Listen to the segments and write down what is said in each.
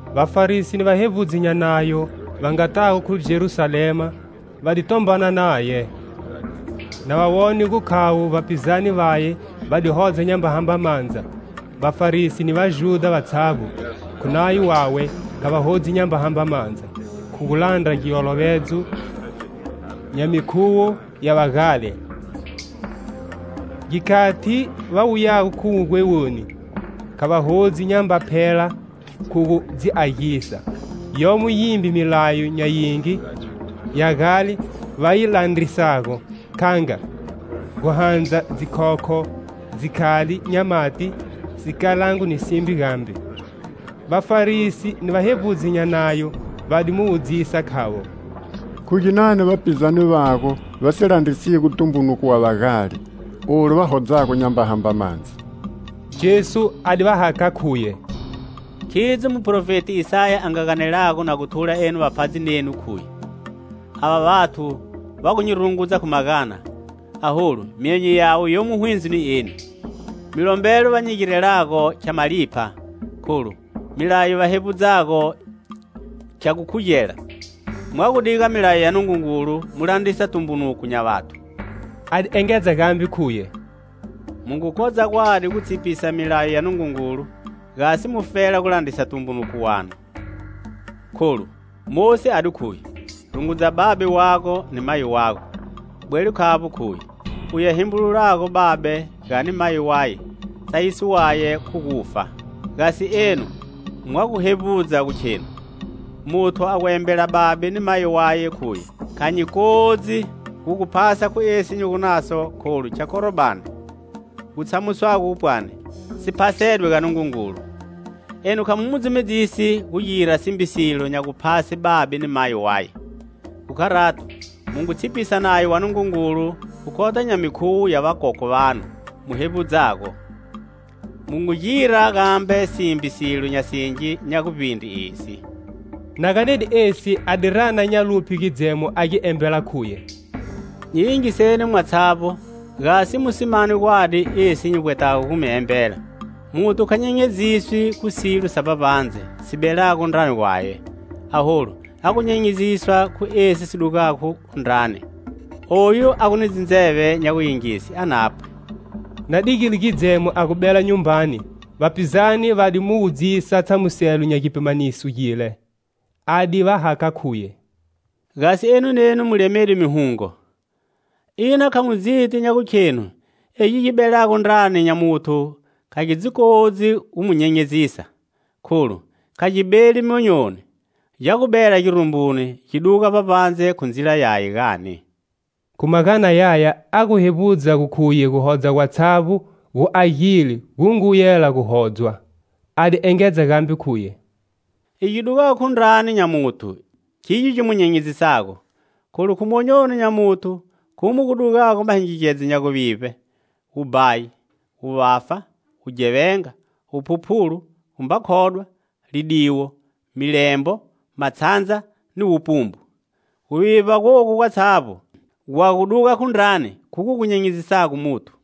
Vafarisi ni vahevbudzi nya Nayo, va ngatago khu Jerusalema, va di tombana naye. Na va wone gu khavo vapizane vaye va di hodza nyamba hamba mandza, Vafarisi, ni Vajudha vatshavbo, khu nayo wawe, kha va hodzi nyamba hamba mandza, khu gulandra giolovedzo nya mikhuwo ya vagale. Gikhati va wuyago khu wugwewoni, kha va hodzi nyamba phela khu gu dzi agisa, yomo yimbe milayo nya yingi ya gale va yi landrisago, kha nga: guhandza dzikhokho, dzikhali nya mati, sikalango ni simbe gambe. Vafarisi ni vahevbudzi nya Nayo va di mu wudzisa khavo: "Khu ginani vapizane vago va si landrisigo tumbunuko wa vagale, olu va hodzago nyamba hamba mandza?" Jesu a di va hakha khuye: "Khidzo muprofeti Isaya a nga ganelago na thula enu vapfhadzi nenu khuye: 'Ava vathu va gu nyi rungudza khu magana aholu myonyo yawe yomo hwindzo ni eni. Milombelo va nyi girelago khya malipha kholu, milayo va hevbudzago khya gu yi khugela.' Mwa gu diga milayo ya Nungungulu mu gu landrisa tumbunuko nya vathu." A di engedza gambe khuye: "Mu ngu kodza gwadi gu tshipisa milayo ya Nungungulu, gasi mufela gu landrisa tumbunuko wanu. Kholu, Mosi a di khuye: 'Rungudza babe wago ni mayi wago.' Bwelo khavbo khuye: 'Uye a hembululago babe, gani mayi waye, tsayiso waye khu gufa!' Gasi enu mwa gu hevbudza gu khenu: 'Muthu a gu embela babe ni mayi waye khuye: kha nyi kodzi gu gu phasa khu esi nyi gu naso kholu khya Korbani, gu tshamusago pwani si phasedwe ga Nungungulu;' enu kha mu mu dzumedzisi gu gira simbe silo nya guphase babe ni mayi waye. Khu kharato, mu ngu tshipisa Nayo wa Nungungulu khu kota nya mikhuwo ya vakokwe vanu mu hevbudzago. Mu ngu gira gambe simbe silo nya singi nya guvbindre esi." Na ganede esi a di rana nya luphye gidzemo a gi embela khuye: "Nyi yingiseni mwatshavbo gasi mu si mane gwadi esi nyi vbwetago gu mi embela! Muthu kha nyenyeziswi khu silo sa vbavbandze si belago ndrani gwaye, aholu a gu nyenyeziswa khu esi si dugago khu ndrani. [ Oyu a gu ni ndzeve nya guyingise a napwe.]" Na digile gidzemo a gu bela nyumbani, vapizane va di mu wudzisa tshamuselo nya gipimaniso gile. A di va hakha khuye: "Gasi enu nenu mu lemede mihungo? Ina kha mu dziti nya gukhenu egi gi belago ndrani nya muthu kha gi dzi kodzi gu mu nyenyezisa, kholu kha gi beli monyoni, gya gu bela girumbuni gi gu duga vbavbandze khu ndzila yaye, gani?" (Khu magana yaya a gu hevbudza gu khuye guhodza gwatshavbo gu agile gu ngu yela gu hodzwa.) A di engedza gambe khuye: "Igyo gi dugago khu ndrani nya muthu khigyo gi mu nyenyezisago. Kholu, khu monyoni nya muthu, khumo gu dugago mahingigedzo nya guvivbe, wubhayi, wuvafa, wughevenga, wuphuphulu, gumba khodwa, lidiwo, milembo, matshandza ni wupumbu. Guvivba gogu gwatshavbo gwa gu duga khu ndrani, khugo gu nyenyezisago muthu."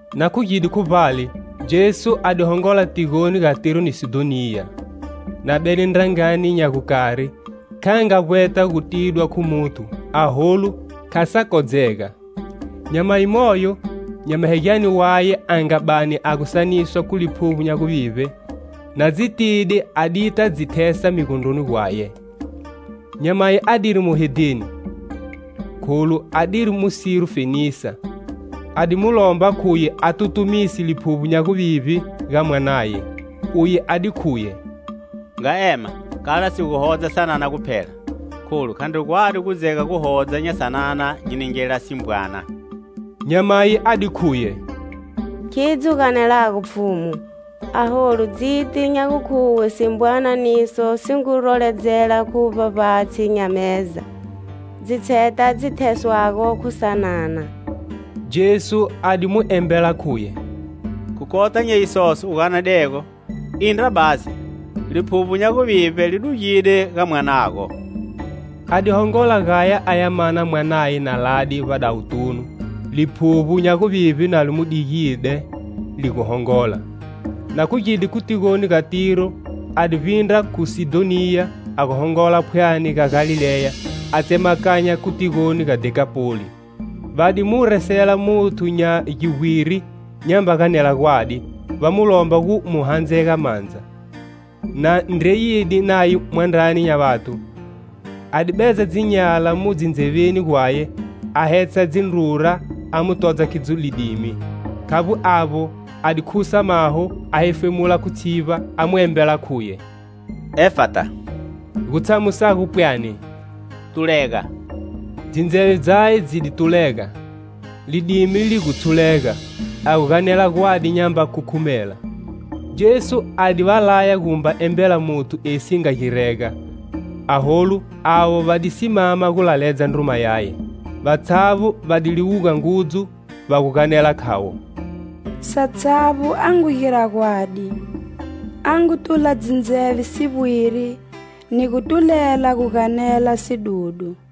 Na khugide khu vbale, Jesu a di hongola tigoni ga Tiro ni Sidhoniya. Na bede ndrangani nya gukari, kha nga vbweta gu tidwa khu muthu, aholu kha sa kodzega. Nyamayi moyo, nyamahegyane waye a nga bani a gu saniswa khu liphuvbo nya guvivbe, na dzitide, a dita dzi thesa migondroni gwaye. Nyamayi adiri muhedheni, kholu adiri Musiro-fenisa, a di mu lomba khuye a tutumise liphuvbo nya guvivbe ga mwanaye. Uye a di khuye: "Nga ema kala si gu hodza sanana guphela, kholu khandri gwadi gu dzega guhodza nya sanana nyi ningela simbwana." Nyamayi a di khuye: "Khidzo u ganelago, Pfhumu, aholu dziti nya gukhuwe simbwana niso si ngu roledzela khu vbavbatshi nya meza dzitsheta dzi theswago khu sanana." Jesu a di mu embela khuye: "Khu kota nya isoso u ganedego, indra basi; liphuvbo nya guvivbe li dugide ga mwanago." A di hongola gaya aya mana mwanaye na lade vbadawutunu; liphuvbo nya guvivbe na li mu digide li gu hongola. Na khugide khu tigoni ga Tiro a di vbindra khu Sidhoniya, a gu hongola phwani ga Galileya a tsemakanya khu tigoni ga Dhekapoli. Va di mu resela muthu nya givbwiri nyamba ganela gwadi, va mu lomba gu mu handzega mandza. Na ndreyide naye mwandrani nya vathu, a di bedza dzinyala mu dzindzeveni gwaye, a hetsha dzindrura a mu todza khidzo lidimi. Khavbo avbo a di khusa maho, a hefemula khu tshivba, a mu embela khuye: "Efata" gutshamusago pwani, "Tulega." Dzindzeve dzaye dzi di tulega, lidimi li gu tshulega, a gu ganela gwadi nyamba khukhumela. Jesu a di va laya gu mba embela muthu esi si nga girega; aholu avo va di simama gu laledza ndruma yaye. Vatshavbo va di liwuga ngudzu va gu ganela khavo: "Satshavbo a ngu gira gwadi: a ngu tula dzindzeve sivbwiri, ni gu tulela gu ganela sidudu"